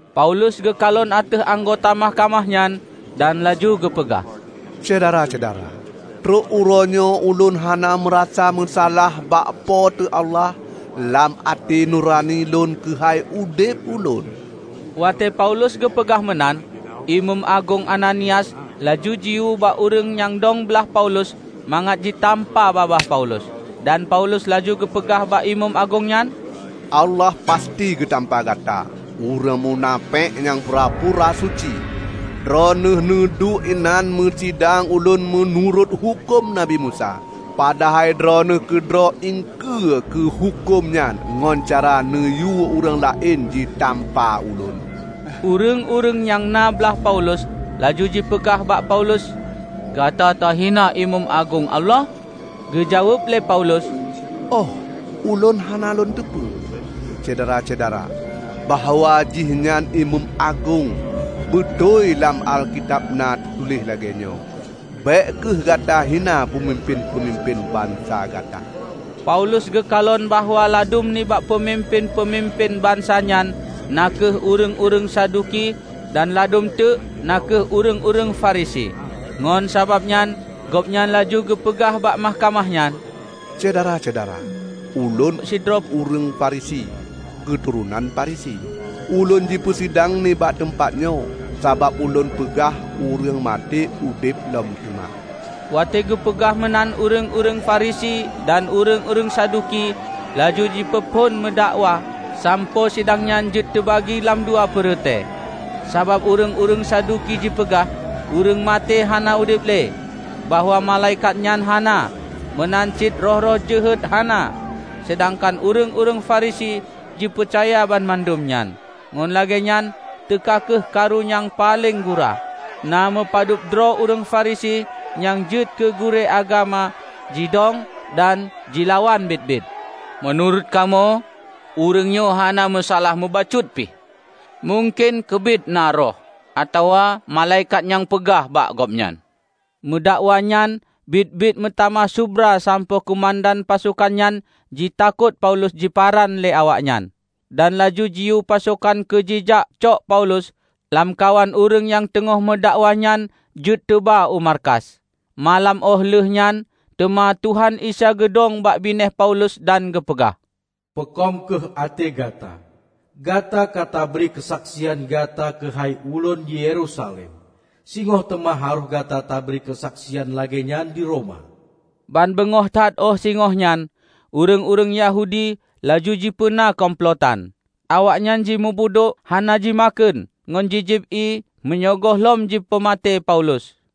Paulus geukalon ateueh anggota mahkamah nyan dan laju geupeugah, "Syedara-syedara! Trok uroenyoe ulôn hana meurasa meusalah bak Po teu Allah lam até nurani lôn keuhai udeb ulôn." Watée Paulus geupeugah meunan, Imeum Agong Ananias laju jiyue bak ureuëng nyang dong blaih Paulus mangat jitampa babah Paulus. Dan Paulus laju geupeugah bak imeum agong nyan, "Allah pasti geutampa gata, ureuëng munafék nyang pura-pura suci! Droeneueh neuduek inan neupeusidang ulôn meunurot huköm Nabi Musa, padahai droeneueh keudroe iengkeue keu huköm nyan ngon cara neuyue ureuëng laén jitampa ulôn!" Ureuëng-ureuëng nyang na blah Paulus laju jipeugah bak Paulus, "Gata tahina Imeum Agong Allah!" Geujaweueb lé Paulus, "Óh, ulôn hana lôn teupeu, syedara-syedara, bahwa jihnyan imeum agong. Beutôi lam Alkitab na teutuléh lagée nyoe, 'Bék kheueh gata hina peumimpén-peumimpén bansa gata.' " Paulus geukalon bahwa ladum nibak peumimpén-peumimpén bansa nyan na kheueh ureuëng-ureuëng Saduki dan ladum teuk na kheueh ureuëng-ureuëng Farisi. Ngon sabab nyan gobnyan laju geupeugah bak mahkamah nyan, "Syedara-syedara! Ulôn sidroe ureuëng Farisi, keuturonan Farisi. Ulôn jipeusidang nibak teumpatnyoe sabab ulôn peugah ureuëng maté udeb lom teuma." Watée geupeugah meunan ureuëng-ureuëng Farisi dan ureuëng-ureuëng Saduki laju jipeuphon meudakwa, sampoe sidangnyan jeuet teubagi lam dua peureute. ( Sabab ureuëng-ureuëng Saduki jipeugah ureuëng maté hana udeb le, bahwa malaikat nyan hana, meunan cit roh-roh jeuhet hana; seudangkan ureuëng-ureuëng Farisi jipeucaya banmandum nyan.) Ngon lagée nyan teuka kheueh karu nyang paleng gura. Na meupadubdroe ureuëng Farisi nyang jeuet keu gurée agama jidong dan jilawan biet-biet. "Meunurot kamoe ureuëng nyoe hana meusalah mubacut pih! Mungken keubiet na roh atawa malaikat nyang peugah bak gobnyan!" Meudakwanyan biet-biet meutamah subra sampoe keumandan pasokan nyan jitakot Paulus jiparan lé awaknyan. Dan laju jiyue pasokan keu jijak cok Paulus lamkawan ureuëng nyang teungoh meudakwanyan jeuet teuba u markas. Malam óh lheueh nyan teuma Tuhan Isa geudong bak binéh Paulus dan geupeugah, "Peukong kheueh até gata! Gata katabri keusaksian gata keuhai ulôn di Yerusalem. Singoh teuma harôh gata tabri keusaksian lagée nyan di Roma." Banbeungoh that óh singoh nyan, ureuëng-ureuëng Yahudi laju jipeuna kumplotan. Awaknyan jimubudok hana jimakheun ngon jijieb ié meunyoe gohlom jipeumaté Paulus.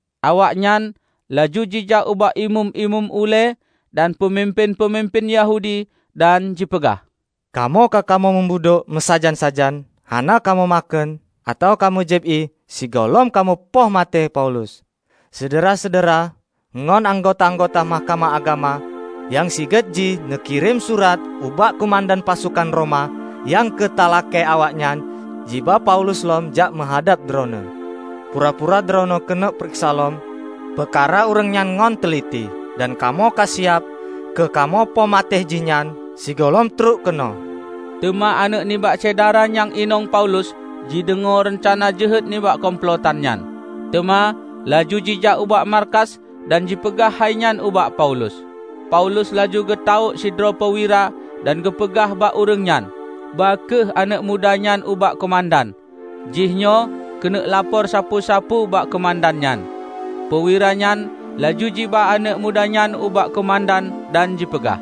Awaknyan laju jijak ubak imeum-imeum ulée dan peumimpén-peumimpén Yahudi dan jipeugah, "Kamoe ka kamoe mubudok meusajan-sajan, hana kamoe makheun atawa kamoe jieb ié sigohlom kamoe poh maté Paulus. Syedara-syedara ngon anggota-anggota Mahkamah Agama nyang sigét jih neukirém surat ubak keumandan pasokan Roma nyan keu talakée awaknyan jiba Paulus lom jak meuhadab droeneueh, pura-pura droeneueh keuneuk pareksa lom peukara ureuëng nyan ngon teuliti. Dan kamoe ka siab keu kamoe poh maté jihnyan sigohlom trok keunoe." Teuma aneuëk nibak syedara nyang inong Paulus jideungoe reuncana jeuhet nibak kumplotan nyan. Teuma laju jijak ubak markas dan jipeugah hainyan ubak Paulus. Paulus laju geutawök sidroe peuwira dan geupeugah bak ureuëng nyan, "Ba kheueh aneuëk mudanyoe ubak keumandan; jihnyoe keuneuk lapor sapeue-sapeue bak keumandan nyan." Peuwira nyan laju jiba aneuëk muda nyan ubak keumandan dan jipeugah,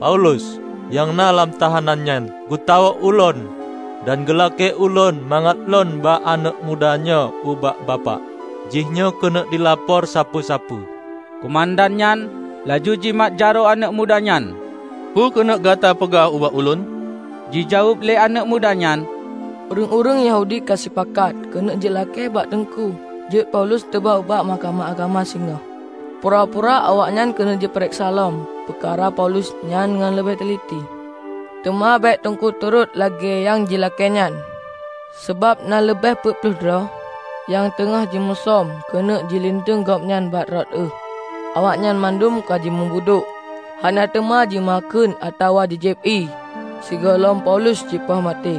"Paulus, nyang na lam tahanan nyan, geutawök ulôn dan geulakée ulôn mangat lôn ba aneuëk muda nyoe ubak Bapak; jihnyoe keuneuk jilapor sapeue-sapeue." Keumandan nyan laju jimat jaroe aneuëk muda nyan, "Peukeuneuk gata peugah ubak ulôn?" Jijaweueb lé aneuëk muda nyan, "Ureuëng-ureuëng Yahudi kasipakat keuneuk jilakée bak Teungku jeuet Paulus teuba ubak Mahkamah Agama singoh, pura-pura awaknyan keuneuk jipareksa lom peukara Paulus nyan ngon leubeh teuliti. Teuma bék Teungku turot lagée nyang jilakée nyan, sabab na leubeh peuet ploh droe nyang teungoh jimusöm keuneuk jilinteueng gobnyan bak rot euh. Awaknyan mandum ka jimubudok hana teuma jimakheun atawa jijieb ié sigohlom Paulus jipoh maté.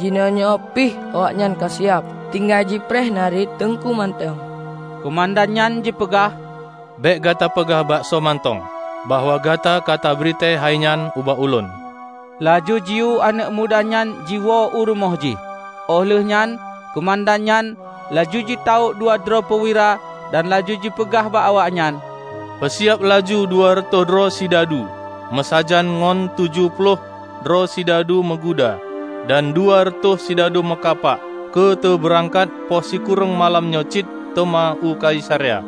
Jinoenyoe pih awaknyan ka siab; tinggai jipreh nariet Teungku mantong." Keumandan nyan jipeugah, "Bék gata peugah bak soe mantong bahwa gata ka tabritée hainyan ubak ulôn." Laju jiyue aneuëk muda nyan jiwoe u rumoh jih. Óh lheuehnyan keumandan nyan laju jitawök dua droe peuwira, dan laju jipeugah bak awaknyan, "Peusiab laju dua reutôh droe sidadu meusajan ngon tujoh ploh droe sidadu meuguda dan dua reutôh sidadu meukapak keu teubeurangkat poh sikureueng malam nyoe cit teuma u Kaisarea.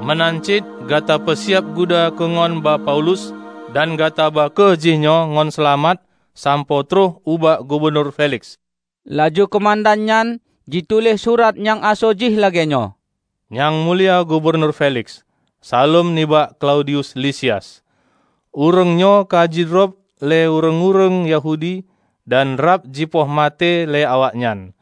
Meunan cit gata peusiab guda keu ngon ba Paulus dan gata ba kheueh jinyoe ngon seulamat sampoe trok ubak Gubunur Feliks." Laju keumandannyan jituléh surat nyang asoe jih lagée nyoe, "Nyang Mulia Gubunur Feliks. Saleuem nibak Klaudius Lisias! Ureuëng nyoe ka jidrob lé ureuëng-ureuëng Yahudi dan rab jipoh maté lé awaknyan,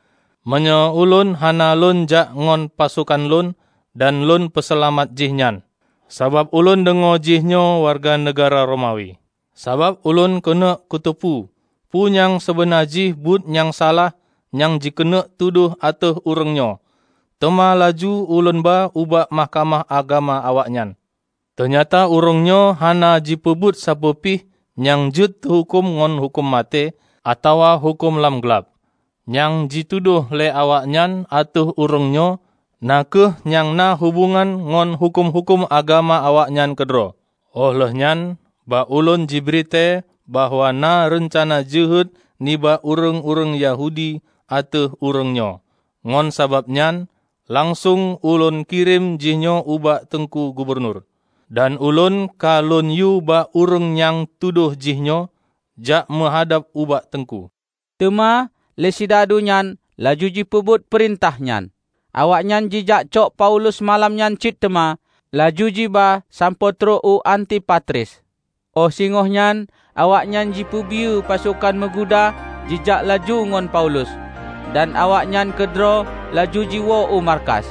meunyoe ulôn hana lôn jak ngon pasokan lôn dan lôn peuseulamat jihnyan; sabab ulôn deungoe jihnyoe wareuga neugahra Romawi. Sabab ulôn keuneuk kuteupeu peue nyang seubeuna jih buet nyang salah nyang jikeuneuk tudoh ateueh ureuëng nyoe, teuma laju ulônba ubak Mahkamah Agama awaknyan. Teunyata ureuëng nyoe hana jipeubuet sapeue pih nyang jeuet tehuköm ngon huköm maté atawa huköm lam glab. Nyang jitudôh lé awaknyan ateueh ureuëng nyoe na kheueh nyang na hubongan ngon huköm-huköm agama awaknyan keudroe. Óh lheueh nyan bak ulôn jibritée bahwa na reuncana jeuhet nibak ureuëng-ureuëng Yahudi ateueh ureuëng nyoe. Ngon sabab nyan langsong ulôn kirém jihnyoe ubak Teungku Gubunur. Dan ulôn ka lônyue bak ureuëng nyang tudoh jihnyoe jak meuhadab ubak Teungku." Teuma lé sidadu nyan laju jipeubuet peurintah nyan. Awaknyan jijakcok Paulus malam nyan cit teuma laju jiba sampoe trok u Antipatris. Óh singohnyan awaknyan jipeubiyeu pasokan meuguda jijak laju ngon Paulus, dan awaknyan keudroe laju jiwoe u markas.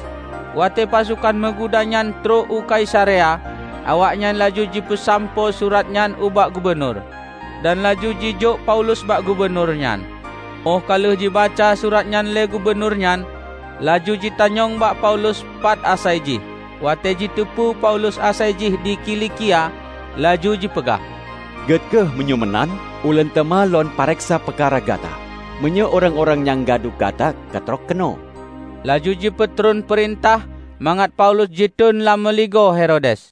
Watée pasokan meuguda nyan trok u Kaisarea, awaknyan laju jipeusampoe suratnyan ubak gubunur, dan laju jijok Paulus bak gubunur nyan. Óh ka lheueh jibaca surat nyan lé gubunur nyan, laju jitanyong bak Paulus pat asai jih. Watée jiteupeu Paulus asaijih di Kilikia, laju jipeugah, "Gét kheueh, meunyoe meunan! Ulôn teuma lôn pareksa peukara gata, meunyoe ureuëng-ureuëng nyang gadu gata katrok keunoe." Laju jipeutron peurintah mangat Paulus jiteuon lam meuligoe Herodes.